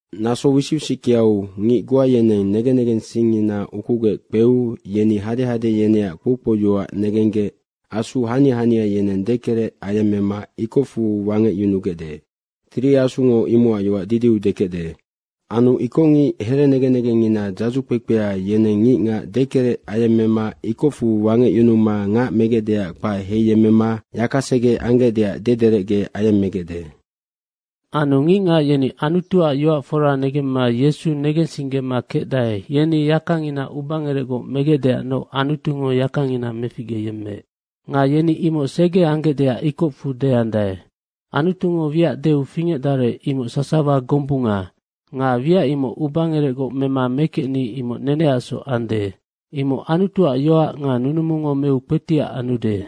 Naso wisic wisickeau ngic goa yeneng negen negensingngina ukugec kpeu, yeni hadehade yeneac kpoukpouyoac negenggec asu hania hania yeneng dekerec ayemmema ikocfu wangecyunugecde. Tiri Asungo imocac yoac didiu dekecde. Anu ikocngic herenegen negengngina dzadzu kpekpea, yeneng ngicngac dekerec ayemmema ikocfu wangecyunuma ngac megecdeac kpae heiyemmema yakasege anggecdeac dederecge ayemmegecde. Anu ngicngac yeni Anutuac yoac fora negemma Yesu negensinggema kecdae, yeni yakangina ubangerecgoc megecdeacnoc Anutungo yakangina meficgeyemmeec nga yeni imoc sege anggecdeac ikocfu deandae. Anutungo wiac deu fingecdarec, imoc sasawa gombunga. Nga wiac imoc ubangerecgoc mema mekecni, imoc neneacsoc ande. Imoc Anutuac yoac nga nunumungo meu kpetiac anude.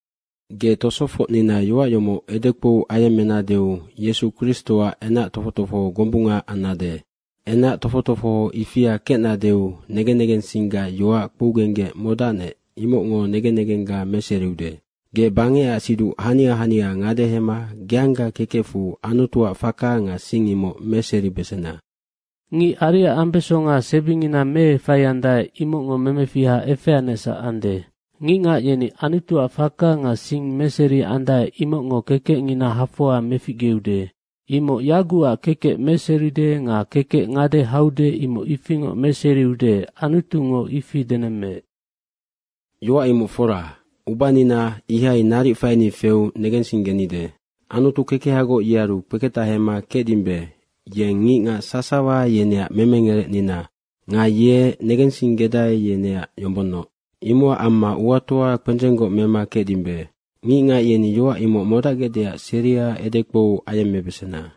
Ge tosofocnina yoac yomoc edekpou ayemmenadeu Yesu Kristoac kingangkpekpe gombunga annade. Kingang kpekpe ifia kecnadeu, negen negensinggac yoac kpougenggec modacnec, imocngo negen negengga meseriude. Ge bangecac siduc hania hania ngadehema geangga kekecfu Anutuac faka nga sing imoc meseribesena. Ngic ariac ambesonga sebingina meefaiandae, imocngo memefiha efeanecsac ande. Ngicngac yeni Anutuac faka nga sing meseriandae, imocngo kekecngina hafoa meficgeude, imoc yagucac kekec meseride nga kekec ngade haude imoc ifingoc meseriude, Anutungo ifi denemmeec. Yoac imoc fora, ubanina ihai naric faini feu negensinggenide. Anutu kekehagoc, yearu kpeketahema kecdimbe, yeng ngicngac sasawa yeneac memengerecnina ande nga ye negensinggedae, yeneac yombonnoc. Imocac amma uatoa kpendzenggoc mema kecdimbe. Nga ngicngac yeni yoac imoc modacgecdeac seria edekpou ayemmebesena.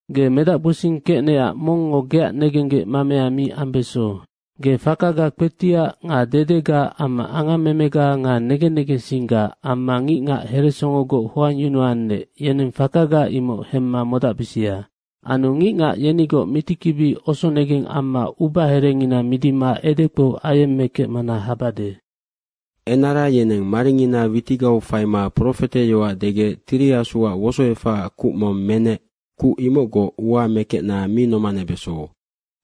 Ge medacgbosing kecnecac mongngo geac negenggec mamea mi ambeso. Nga fakaga kpetiac nga dedega amma angammemega nga negen negensingga amma ngicngac heresongogoc hoangyunuannec, yeneng fakaga imoc hemma modacbisia. Anu ngicngac yenigoc mitikibi osonegeng amma ubaherengina midima edekpou ayemmekecmana habade. Nga enara yeneng maringina witigau faima profeteyoac degec Tiri Asuac wosoefacac kuc mong menec, kuc imocgoc ua mekecna mi nomanebeso.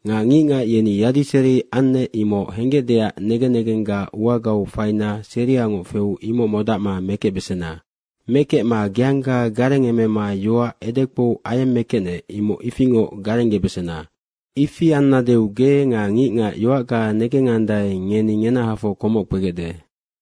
Nga ngicngac yeni yadiseri annec, imoc henggecdeac negen negengga uagau faina seriangoc feu imoc modacma mekecbesena. Mekecma geangga garengemema yoac edekpou ayemmekecnec, imoc ifingoc garenggebesena. Ifi annadeu ge nga ngicngac yoacga negengandae, ngeni ngenahafoc komoc kpegecde.